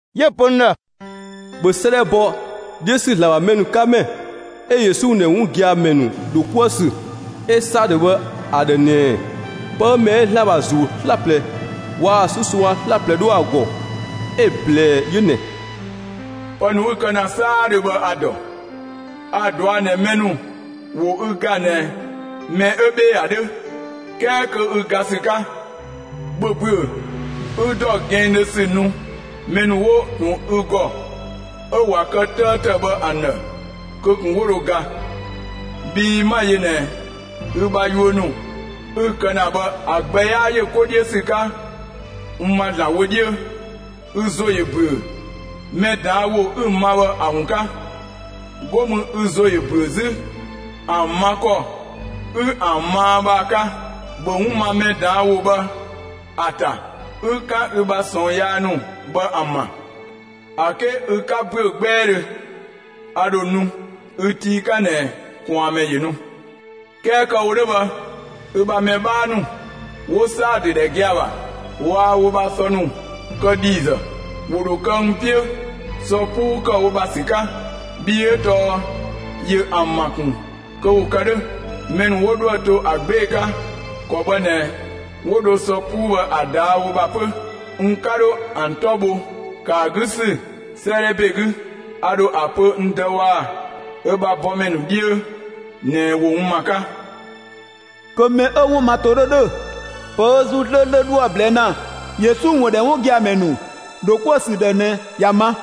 'Yö‑ pö n ‑dhë: «‑Bhö 'sëëdhɛ bɔ 'dhiö ‑sü ‑Zlan ‑bha mɛ ‑nu 'ka ‑mɛ 'ö Yesu ‑wun ‑dhɛ 'wun gia‑ ‑mɛ ‑nu ‑dho 'kuë‑ ‑sü 'ö Saadö bhë ‑a ‑dhë ꞊nɛɛ: Pë 'ö mɛ 'ö ‑Zlan ‑bha ‑Zuu 'slaplɛ waa‑ 'susongga 'slaplɛ 'dho ‑a ‑gɔ 'ö‑ ꞊blɛɛ 'yö ꞊nɛ: Pë ‑nu 'ü‑ kë ‑na 'saadhö bhë a‑ ‑dɔ. A‑ ꞊dɔa' ꞊nɛ mɛ ‑nu ‑wo ü ga ꞊nɛ mɛ 'ö 'bhee‑ ‑a 'dhö, 'kɛɛ kö ü ga ‑sü 'ka. ‑Bhö ‑büö, 'ü ‑dɔ gɛnngdhö ‑sü nu mɛ ‑nu 'wo ꞊tun ü ‑gɔ, 'ö ꞊wa kë 'tëëtë bhë ‑an ‑dhë kö ꞊kun 'wo dho ga. Bhii 'ma‑ yö ꞊nɛ ü bha yuö ‑nu 'ü‑ kë ‑na bhë ‑a gbɛ 'yaa ‑yö 'ko 'dhiö ‑sü 'ka n ma ‑Zlan wö 'dhiö. Ü ‑zo ‑yö ‑büö mɛ ꞊daan' ‑wo 'ü‑ ma bhë ‑a ‑wun 'ka! 'Go mü ü ‑zo ‑yö ‑büö 'zü ‑an ma ‑kɔ 'ü ‑an maa bhë ‑a 'ka. ‑Bhö 'wun ma mɛ ꞊daan' ‑wo bhë ‑a ‑ta, 'ü 'kan ü bha ꞊sɔɔn yaa ‑nu bhë ‑an ‑bha. ‑A 'ke ü 'ka ‑büö 'gbɛɛdhö, a ‑dho nu ü tii 'ka ꞊nɛ ꞊kwaanmɛ ‑yö nu. 'Kɛɛ kë‑ wo 'dhö bhë, ü ‑bha mɛ 'bhaa ‑nu 'wo Saadö ‑dhɛ gia‑ ‑bha, waa wo ‑bha sɔ ‑nu kë ‑dhiizë. ‑Wo ‑dho kë n 'piö sɔ 'puu ‑kë wo ‑bha ‑sü 'ka. Bhii 'ö tɔɔ ‑yö ‑an ‑ma ‑kun kö ‑wo kë 'dhö. Mɛ ‑nu 'wo 'dhoë‑ to ‑a 'gbee‑ 'ka, ‑kɔ bhë ꞊nɛ 'wo dho sɔ 'puu bhë ‑a ꞊daa' wo ‑bha 'pö, n 'ka 'dho ‑an 'tɔ bho ‑kë ‑a 'gü ‑sü 'sëëdhɛ ‑be 'gü; a ‑dho ‑a pö n Dë waa‑ ö ‑bha bɔmɛ ‑nu 'dhiö ꞊nɛ ‑wo n ‑ma 'ka. Kö mɛ 'ö‑ 'wun ma 'to 'dhö ‑dhö, pë 'ö ‑Zuu 'slööslö 'dhoë‑ ꞊blɛɛ' ‑na Yesu ‑wun ‑dhɛ 'wun gia‑ ‑mɛ ‑nu ‑dho 'kuë‑ ‑sü ‑dhë ꞊nɛ ‑ya ma!»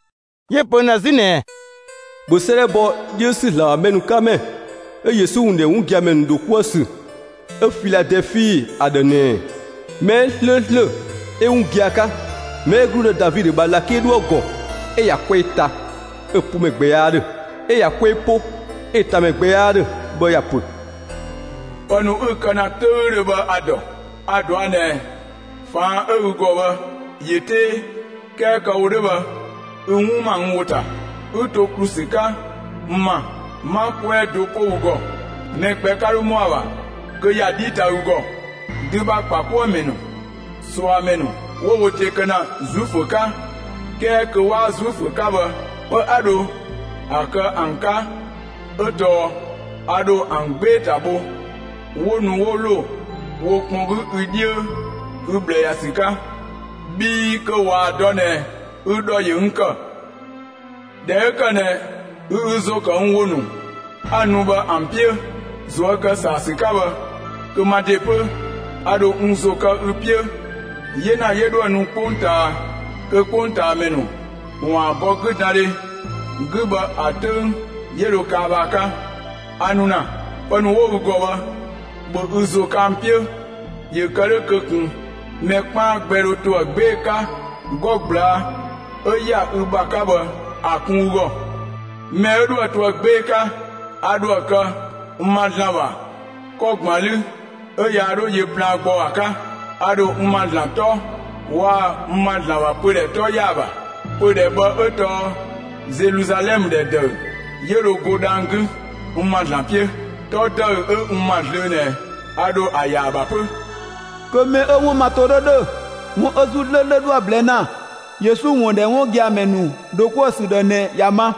'Yö‑ pö n ‑dhë 'zü ꞊nɛɛ: «‑Bhö 'sëëdhɛ bɔ 'dhiö ‑sü ‑Zlan ‑bha mɛ ‑nu 'ka ‑mɛ 'ö Yesu ‑wun ‑dhɛ 'wun gia‑ ‑mɛ ‑nu ‑dho 'kuë‑ ‑sü 'ö Filadɛɛfi ‑a ‑dhë ꞊nɛɛ: Mɛ 'ö 'slööslö 'ö 'wun giagia 'ka, mɛ 'ö ‑gludë Davidö ‑bha ꞊lakele 'dhoë‑ ‑gɔ, 'ö ꞊ya 'kwɛɛ ta, 'ö‑ 'po ‑mɛ gbɛ 'yaa 'dhö, 'ö ꞊ya 'kwɛɛ 'po 'ö‑ ta ‑mɛ gbɛ 'yaa 'dhö bhë ‑ya ‑pö: Pë ‑nu 'ü‑ kë ‑na 'töüdhö bhë a‑ ‑dɔ. A‑ ꞊dɔa' ꞊nɛ ꞊faan' 'ö ü ‑gɔ bhë, ‑yö 'tee; 'kɛɛ kë‑ wo 'dhö bhë, ü 'wun ‑ma n ‑wo ‑ta, 'ü to ‑klu ‑sü 'ka n ‑ma; 'ma 'kwɛɛ do 'po ü ‑gɔ; mɛ gbɛ 'ka 'dho ‑mɔa ‑bha kö ‑ya 'dhi ta ü ‑gɔ. Dü ‑bha ‑kpakuëmɛ ‑nu, ꞊suamɛ ‑nu 'wo wo ‑de kë ‑na Zuifö 'ka, 'kɛɛ kö 'waa Zuifö 'ka bhë, pë 'a dho ‑a kë ‑an 'ka 'ö tɔɔ: A ‑dho ‑an 'gbee‑ ‑ta bho 'wo nu 'wo ‑lo wo kpɔn 'gü ü 'dhiö ü ꞊bhlë ‑ya ‑sü 'ka. Bhii kö ꞊waa‑ dɔ ꞊nɛ ü ‑dhɔ ‑yö n ‑kë. ꞊Dhɛ 'ö ‑kë ꞊nɛ ü ü ‑zo ‑kë n ‑wo ‑nu 'a‑ nu bhë ‑an 'piö, ꞊zuö' ‑kë ‑saa ‑sü 'ka bhë, kö ma ‑de 'pö, a ‑dho n ‑zo kë ü 'piö 'yena 'yö 'dhoë‑ nu 'kpongtaa kö 'kpongtaamɛ ‑nu ‑waan bɔ 'güdandhe 'gü bhë ‑a 'töng 'yö dho kaa bhë ‑a 'ka. A nu ‑na; pë ‑nu 'wo ü ‑gɔ bhë, ‑bhö ü ‑zo kë ‑an 'piö ‑yö kë 'dhö kö ꞊kun mɛ 'kpaan gbɛ dho ‑to ‑a 'gbee‑ 'ka 'gɔ ꞊gblaa' 'ö ‑ya ü ‑bha 'ka bhë ‑a kun ü ‑gɔ! Mɛ 'ö 'dhoë‑ to ‑a 'gbee‑ 'ka, a ‑dhoë kë n ‑ma ‑Zlan ‑bha 'kɔ ‑gban 'lü 'ö yaa 'dho yö plaan gbɔ ‑a 'ka; a ‑dho n ‑ma ‑Zlan 'tɔ waa‑ n ‑ma ‑Zlan ‑bha pödhɛ 'tɔ ‑ya ‑a ‑bha. Pödhɛ bhë 'ö tɔɔ Zeluzalɛmë ‑dhɛ ‑dëü 'yö dho go dhang‑ 'gü, n ‑ma ‑Zlan 'piö. 'Tɔ ‑dëü 'ö n ‑ma zlöö ꞊nɛ a ‑dho ‑a ‑ya ‑a ‑bha 'pö. Kö mɛ 'ö‑ 'wun ma ‑to 'dhö ‑dhö, 'wun 'ö ‑Zuu 'slööslö 'dhoë‑ ꞊blɛɛ' ‑na Yesu ‑wun ‑dhɛ 'wun gia‑ ‑mɛ ‑nu ‑dho 'kuë‑ ‑sü ‑dhë ꞊nɛ ‑ya ma!»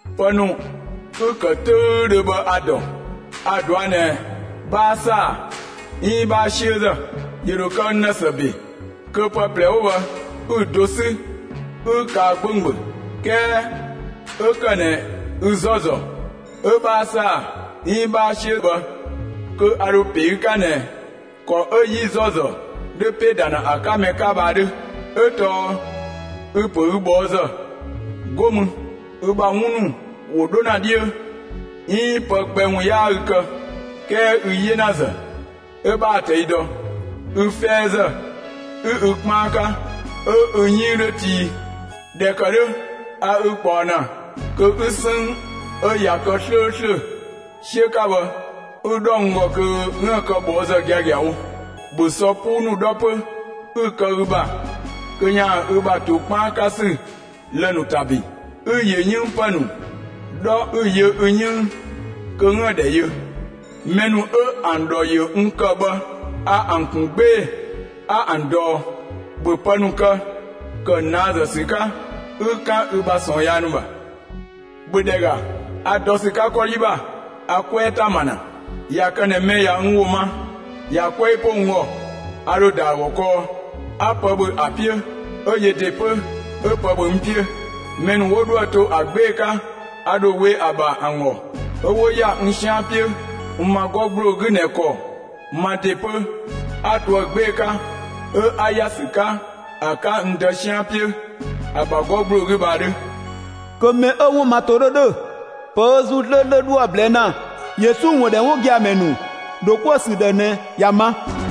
Pë ‑nu 'ü‑ ‑kë 'töüdhö bhë a‑ ‑dɔ. A‑ ꞊dɔa' ꞊nɛ 'bhaa ‑saa 'iin 'bhaa 'siözë. ‑Yö ‑dho kë n ‑dhë ‑së ‑be kö pë ꞊plɛ 'wo bhë 'ü‑ do 'sü 'ü kaa 'gbönggböng. 'Kɛɛ 'ö ‑kë ꞊nɛ ü 'zɔzɔ, 'ö 'bhaa ‑saa 'iin 'bhaa 'siö‑ bhë kö a ‑dho ‑pe ü 'ka ꞊nɛ ‑kɔ 'ö 'yi 'zɔzɔ 'dhö ‑pë ‑da ‑na ‑a 'ka mɛ 'ka bhë ‑a 'dhö. 'Ö tɔɔ ü‑ ‑pö ü ꞊bhɔɔzë, 'go mü ü ‑bha 'wun ‑nu ‑wo 'dho ‑na 'dhiö, 'iin pë gbɛ ‑wun 'yaa ü kë. 'Kɛɛ ü 'yenazë, 'ö 'bhaa‑ ꞊tɛi' dɔ. Ü 'fɛɛzë, 'ü ü 'kpaan 'ka 'ö ü 'yënng 'dho tii. ꞊Dhɛ ‑kë 'dhö, 'a ü ꞊kpaɔ ‑na kö 'ü 'sënng 'ö ꞊ya kë 'slööslö 'siö 'ka bhë 'ü‑ 'dhɔ n ‑gɔ kö 'üën‑ kë ꞊bhɔɔzë giagiawo. ‑Bhö sɔ 'puu ‑nu 'dhɔ 'pö 'ü‑ kë ü ‑bha kö ‑yaan ü ‑bha ‑to 'kpaan ‑sü lë‑ ‑nu ‑ta ‑bin. 'Ü ‑yö 'yënng pë 'yi 'dhɔ 'ü‑ yö ü 'yënng kö 'üën‑ ‑dhɛ yö. Mɛ ‑nu 'ö ‑an ‑dhɔ ‑yö n ‑kë bhë a ‑an ‑kun 'gbee‑ 'a ‑an ꞊dɔɔ. ‑Bhö pë ‑nu kë, ‑kë ꞊naazë ‑sü 'ka, 'ü 'kan ü ‑bha ꞊sɔɔn yaa ‑nu ‑bha! ‑Bhö ‑dhɛ ‑ga, a dɔ ‑sü 'ka 'kɔdhi ‑bha, 'a 'kwɛɛ ‑ta ‑ma ‑na; ꞊ya kë ꞊nɛ mɛ ꞊ya n ‑wo ma ꞊ya 'kwɛɛ 'po n ‑gɔ, a ‑dho ‑da ‑a ‑gɔ kɔɔ, 'a pë ‑bhö ‑a 'piö, 'ö yö ‑de 'pö 'ö pë ‑bhö n 'piö. Mɛ ‑nu 'wo 'dhoë‑ to ‑a 'gbee‑ 'ka, a ‑dho we ‑a ‑bha ‑an ‑gɔ 'ö 'wo ‑ya n 'sian 'piö n ‑ma 'gɔ ‑gbloo 'gü ꞊nɛ ‑kɔ ma ‑de 'pö 'a toë 'gbee‑ 'ka, 'ö 'a ‑ya ‑sü 'ka ‑a 'ka n Dë 'sian 'piö, ‑a ‑bha 'gɔ ‑gbloo 'gü bhë ‑a 'dhö. Kö mɛ 'ö‑ 'wun ma ‑to 'dhö ‑dhö, pë ö ‑Zuu 'slööslö 'dhoë‑ ꞊blɛɛ' ‑na Yesu ‑wun ‑dhɛ 'wun gia‑ ‑mɛ ‑nu ‑dho 'kuë‑ ‑sü ‑dhë ꞊nɛ, ‑ya ma!»